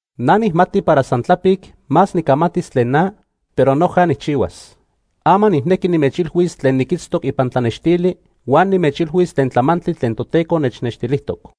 Na nijmati para san tlapic más nicamatis tlen na, pero noja nijchihuas. Ama nijnequi nimechilhuis tlen niquitztoc ipan tlanextili huan nimechilhuis tlen tlamantli tlen Toteco nechnextilijtoc.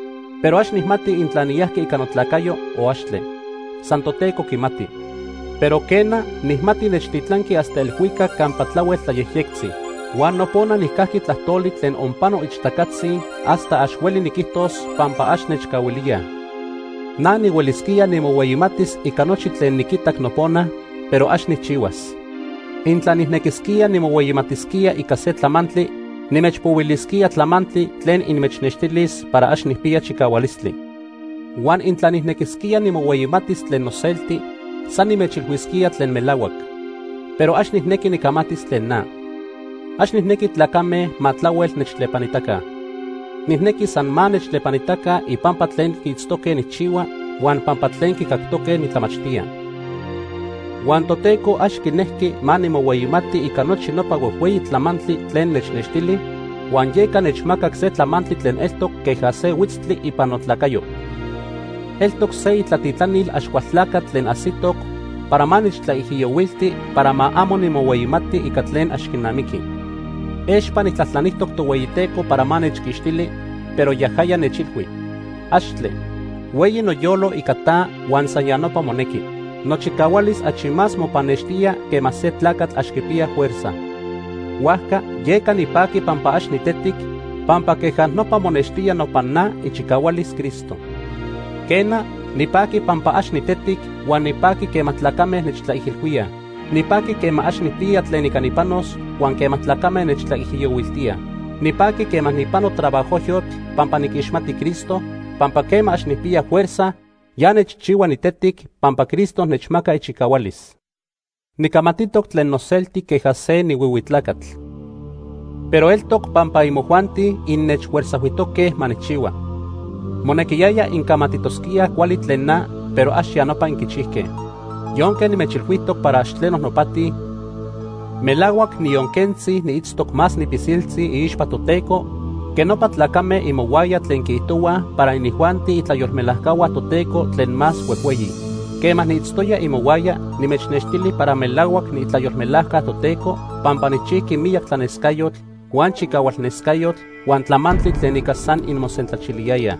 Pero ax nijmati intla niyajqui ica notlacayo o axtle. San Toteco quimati. Pero, quena, nijmati nechtilanqui hasta elhuicac campa tlahuel tlayejyectzi. Huan nopona nijcajqui tlajtoli tlen onpano ixtacatzi hasta ax hueli niquijtos pampa ax nechcahuilíaj. Na nihuelisquía nimohueyimatis ica nochi tlen niquitac nopona, pero ax nijchihuas. Intla nijnequisquía nimohueyimatisquía ica se tlamantli, nimechpohuilisquía tlamantli tlen inmechnextilis para ax nijpiya chicahualistli. Huan intla nijnequisquía nimohueyimatis tlen noselti, san nimechilhuisquía tlen melahuac. Pero ax nijnequi nicamatis tlen na. Ax nijnequi tlacame ma tlahuel nechtlepanitaca. Nijnequi san ma nechtlepanitaca ipampa tlen quiitztoque nijchihua huan pampa tlen quicactoque nitlamachtía. Huan Toteco ax quinejqui ma nimohueyimati ica nochi nopa huejhueyi tlamantli tlen nechnextili, huan yeca nechmacac se tlamantli tlen eltoc queja se huitztli ipan notlacayo. Eltoc se itlatitlanil Axcualtlacatl tlen ajsitoc para ma nechtlaijiyohuilti para ma amo nimohueyimati ica tlen ax quinamiqui. Expa nijtlajtlanijtoc Tohueyiteco para ma nechquixtili, pero yajaya nechilhui: “¡Axtle! Hueyi noyolo ica ta huan san ya nopa monequi. Nochicahualis achi más mopannextía quema se tlacatl ax quipiya fuerza.” Huajca yeca nipaqui pampa ax nitetic, pampa queja nopa monextía nopan na ichicahualis Cristo. Quena, nipaqui pampa ax nitetic huan nipaqui quema tlacame nechtlaijilhuíaj. Nipaqui quema ax nijpiya tlen ica nipanos huan quema tlacame nechtlaijiyohuiltíaj. Nipaqui quema nijpano trabajojyotl pampa niquixmati Cristo, pampa quema ax nijpiya fuerza, ya nechchihua nitetic pampa Cristo nechmaca ichicahualis. Nicamatitoc tlen noselti queja se nihuihui tlacatl. Pero eltoc pampa imojuanti innechfuerzajhuijtoque ma nijchihua. Monequiyaya incamatitosquíaj cuali tlen na, pero ax ya nopa inquichijque. Yonque nimechilhuijtoc para ax tleno nopati, melahuac niyon quentzi niitztoc más nipilsiltzi iixpa Toteco que nopa tlacame imohuaya tlen quiijtohuaj para inijuanti itlayolmelajcahua Toteco tlen más huejhueyi. Quema niitztoya imohuaya nimechnextili para melahuac niitlayolmelajca Toteco pampa nijchijqui miyac tlanescayotl, huan chicahualnescayotl, huan tlamantli tlen ica san inmosentlachiliyayaj.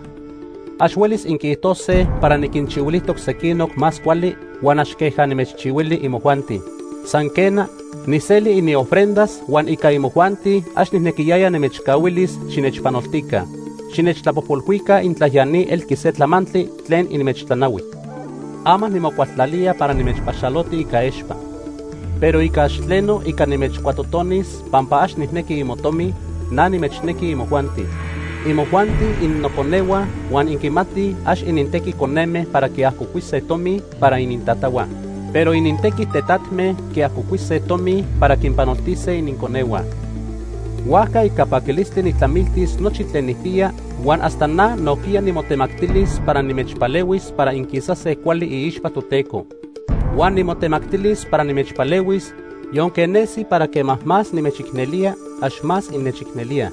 Ax huelis inquiijtose para niquinchihuilijtoc sequinoc más cuali huan ax queja nimechchihuili imojuanti. San, quena, nijseli iniofrendas huan ica imojuanti ax nijnequiyaya nimechcahuilis xinechpanoltica. Xinechtlapojpolhuica intla ya ni elqui se tlamantli tlen inmechtlanahui. Ama nimocualtlalía para nimechpaxaloti ica expa. Pero ica ax tleno ica nimechcuatotonis pampa ax nijnequi imotomi, na nimechnequi imojuanti. Imojuanti innoconehua huan inquimatij ax inintequi coneme para quiajcocuise tomi para inintatahua, pero inintequi tetatme quiajcocuise tomi para quinpanoltise ininconehua. Huajca ica paquilistli nijtlamiltis nochi tlen nijpiya huan hasta na nojquiya nimotemactilis para nimechpalehuis para inquisase cuali iixpa Toteco. Huan nimotemactilis para nimechpalehuis yonque nesi para quema más nimechicnelía, ax más innechicnelíaj.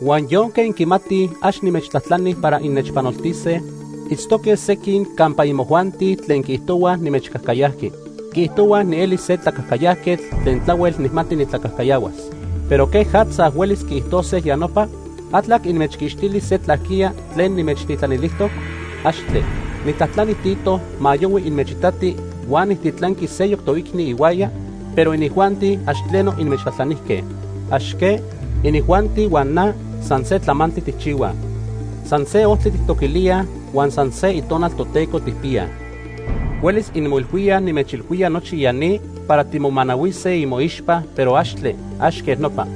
Huan yonque inquimatij ax nimechtlajtlani para innechpanoltise, itztoque sequin campa imojuanti tlen quiijtohuaj nimechcajcayajqui. Quiijtohuaj nieli se tlacajcayajquetl tlen tlahuel nijmati nitlacajcayahuas. Pero ¿quejatza huelis quiijtose ya nopa? ¿Atlac inmechquixtili se tlaquiya tlen nimechtitlanilijtoc? ¡Axtle! Nijtlajtlani Tito ma yohui inmechitati huan nijtitlanqui seyoc toicni ihuaya, pero inijuanti ax tleno inmechtlajtlanijque. ¿Ax que? Inijuanti huan na san se tlamantli tijchihuaj. San se ojtli tijtoquilíaj huan san se Itonal Toteco tijpiyaj. Huelis inmoilhuíaj nimechilhuía nochi ya ni para timomanahuise imoixpa, pero axtle, ax quej nopa.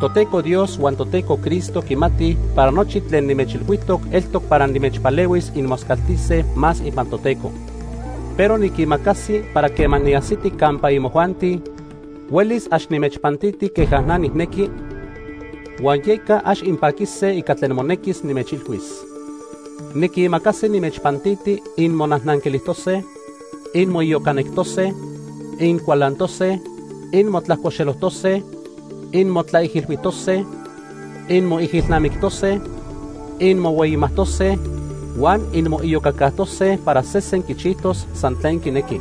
Toteco Dios huan Toteco Cristo quimatij para nochi tlen nimechilhuijtoc eltoc para nimechpalehuis inmoscaltise más ipan Toteco. Pero niquimacasi para quema niajsiti campa imojuanti, huelis ax nimechpantiti queja na nijnequi, huan yeca ax inpaquise ica tlen monequis nimechilhuis. Niquimacasi nimechpantiti inmonajnanquilijtose, inmoiyocanectose, incualantose, inmotlajcoxelojtose, inmotlaijilhuijtose, inmoijilnamictose, inmohueyimajtose huan inmoiyocacajtose para sesen quichijtos san tlen quinequi.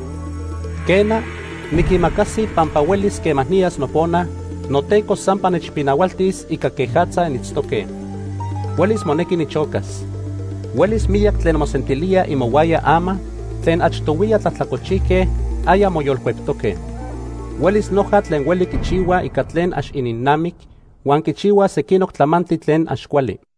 Quena, niquimacasi pampa huelis quema niyas nopona, noTeco sampa nechpinahualtis ica quejatza initztoque. Huelis monequi nichocas. Huelis miyac tlen mosentilíaj imohuaya ama tlen achtohuiya tlajtlacolchijque aya moyolcueptoque. Huelis noja tlen hueli quichihuaj ica tlen ax ininnamic huan quichihuaj sequinoc tlamantli tlen ax cuali.